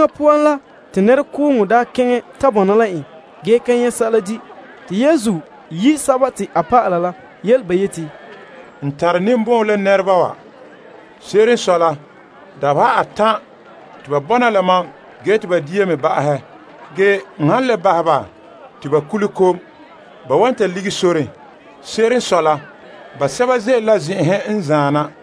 Pooren te nɛrekooŋɔ daa ta bɔna la en ge ka nyɛ' sɛla di', te Yesu yi' a dɔlɔba la yele ba yeti, N tare ninbɔn'ɔn la nɛreba wa la dabeha atan' te ba bɔna la mam ge te ba ka tare dia la zuo. N han bahɛ ba te ba kule kom, ba wan ta lige soren. Se'ere n sɔe la basɛba ze'ele la zen'enhe n zaan na.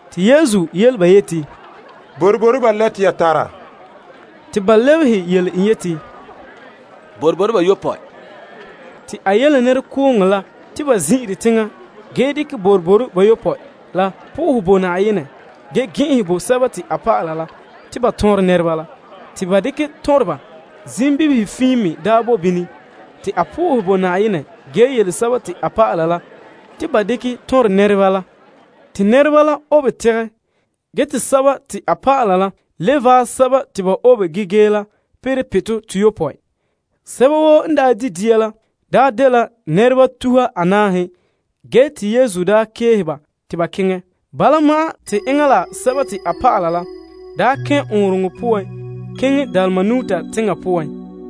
Yesu soke ba yeti, Boroboro ba lɛ te ya tara? Te ba lebehe en yeti, Boroboro bayopɔe. A yele nɛrekooŋɔ la te ba zin'ire teŋa. En dekɛ boroboro bayopɔe la bo Na'ayenɛ fara, a gɛn'ɛnhɛ bo a dɔlɔba la te ba tɔnrɛ nɛreba la. Te ba dekɛ tɔnrɛ ba. Zimbibihe fiin me bɔna bini. A bo Na'ayenɛ fara ge yele a dɔlɔba la te ba dekɛ tɔnrɛ nɛreba la. Te nɛreba la obe tegɛ. Ge te a dɔlɔba la le vaɛ sɛba te ba obe ge gee la perɛ pitɔ toyopɔe. Sɛba woo n daa di' dia la, daa dela nɛreba tuha anaahe. Ge te Yesu daa keehe ba te ba keŋɛ, enŋa la a dɔlɔba la daa kɛn' ɔɔnrɔŋɔ poan keŋɛ Dalmanuta teŋa poan.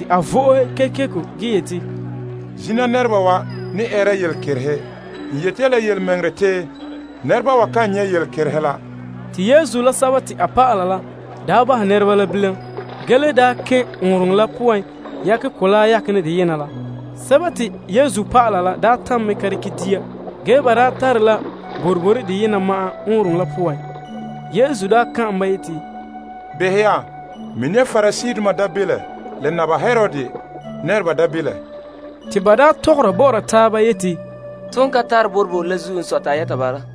A vo'ohe ge yeti, Zina nɛreba wa ne eere danlehom. N yeti ya la yelemɛŋɛrɛ, te nɛreba wa kan nyɛ' danlehom la. A bahɛ ba bilam ge le kɛn' ɔɔnrɔŋɔ la poan yakɛ mɔgɔrɛ la yaken dena la. A dɔlɔba la daa tam mɛ ka dekɛ dia, ge ba daa tare la boroboro deyena ma'an ɔɔnrɔŋɔ la poan. Yesu ka'an ba yeti, Behɛ ya, mini ya Pariseedoma mi'ihom la Herod nɛreba mi'ihom. Dɔlɔba tɔgɔra bɔ'ɔra taaba yeti, To ka tare boroboro la zuo n sɔe te a yɛta bala.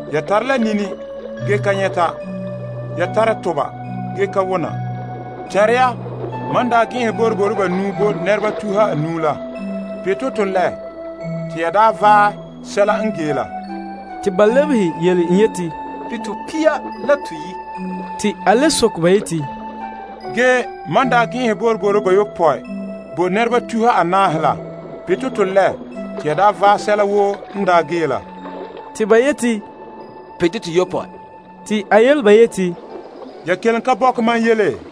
Ya tara la nini ge ka nyɛta? Ya tara toba ge ka wona? Tɛnra ya, mam daa gɛn'ɛnhɛ boroboro banuu bo nɛreba tuha anuu la, pitɔ to lɛ te ya daa vaɛ sɛla n gee la? Te ba lebehe en yeti, Pitɔ pia la toyi'. A le soke ba yeti, Ge mam daa gɛn'ɛnhɛ boroboro bayopɔe bo nɛreba tuha anaahe la, pitɔ to lɛ te ya daa vaɛ sɛla woo n daa gee la? Te ba yeti, Pitɔ toyopɔe. A yele ba yeti, Ya kelen ka bɔkɛ mam yele?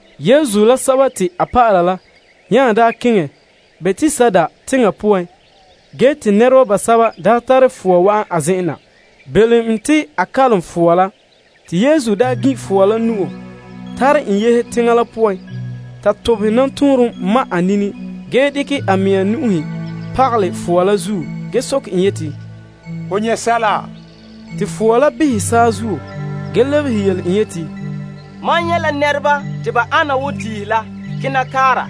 Yesu la a dɔlɔba la nya daa keŋɛ Betsaida teŋa poan ge te nɛreba basɛba tare fowa wa'an a zen'en na, belom en te a kalom fowa la. A gin' fowa la nu'o tare en yehe teŋa la poan. En ta tobehɛ nɔtɔɔnrom ma' a nini, a dekɛ a mea nu'uhe pagalɛ fowa la zuo ge soke en yeti, Ho nyɛ' sɛla? Fowa la behɛ saazuo ge lebehe en yeti, Mam nyɛ' la nɛreba te ba ana wo tiihe la kena kaara.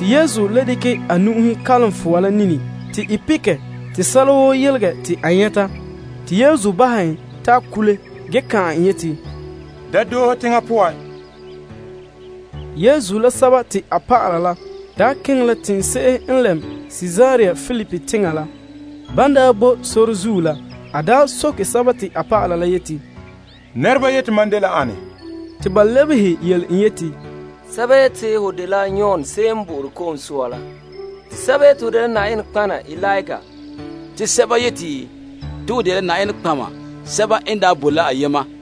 Yesu le dekɛ a nu'uhe kalom fowa la nini te i pekɛ te sɛla woo yelegɛ te a nyɛta. Yesu bahɛ en ta kule ge ka'an en yeti, Da doohe teŋa poan. Yesu la a dɔlɔba la daa keŋɛ la teŋse'ehe n lɛm Kaesarea Filipi teŋa la. Ban daa boe la sore zuo la, a soke a ba la yeti, Nɛreba yeti mam dela ane? Ba lebehe en yeti, Sɛba yeti te ho dela Yon Ko'sɔɔra la, te sɛba yeti te ho dela Eliya, te sɛba yeti te ho dela nɔtɔgɔheba sɛba n daa boe la ayema.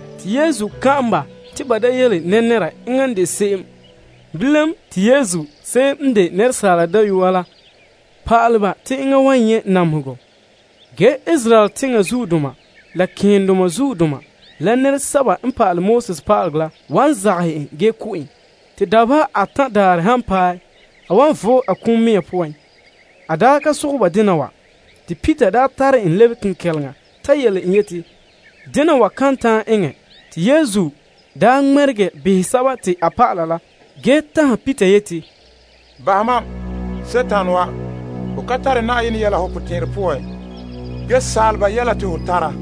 Te Yesu kan'an ba te ba da yele nɛnɛra enŋa n de se'em. Bilam, te Yesu daa pɔhɛ pa'ala ba te Asaala Dayɔa la wan nyɛ' namehegɔ ge Israel zuodoma la malema keendoma la pa'alegɔ pa'aleba la wan zagahɛ en. Ge te ba wan ko' en te dabeha atan' daarɛ han paɛ, a wan vo'e a kum mea la poan. A ka sogɛ ba dena wa te Peter daa tare en lebe kenkɛleŋa ta yele en te dena wa kan ta'an eŋɛ. Ge Yesu ŋmɛregɛ behɛ a dɔlɔba la ge tanhɛ Peter yeti, Bahɛ mam, Dima wa. Ho ka tare Na'ayenɛ yɛla ho potɛn'ɛrɛ poan, ge asaala yɛla te ho tara.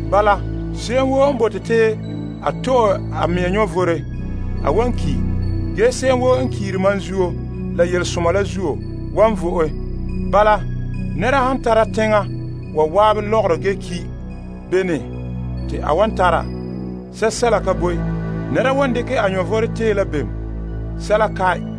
Bala, se'em woo n bote te a to'e a mea vom, a wan ki'. Ge se'em woo n kiiri mam zuo la yelesoma la zuo, wan vo'e. Nɛra han tara teŋa wa zan'an lɔgɔrɔ ge ki', bene te a wan tara? Sɛsɛla ka boe. Nɛra wan dekɛ a vom tee la bem? Sɛsɛla kae.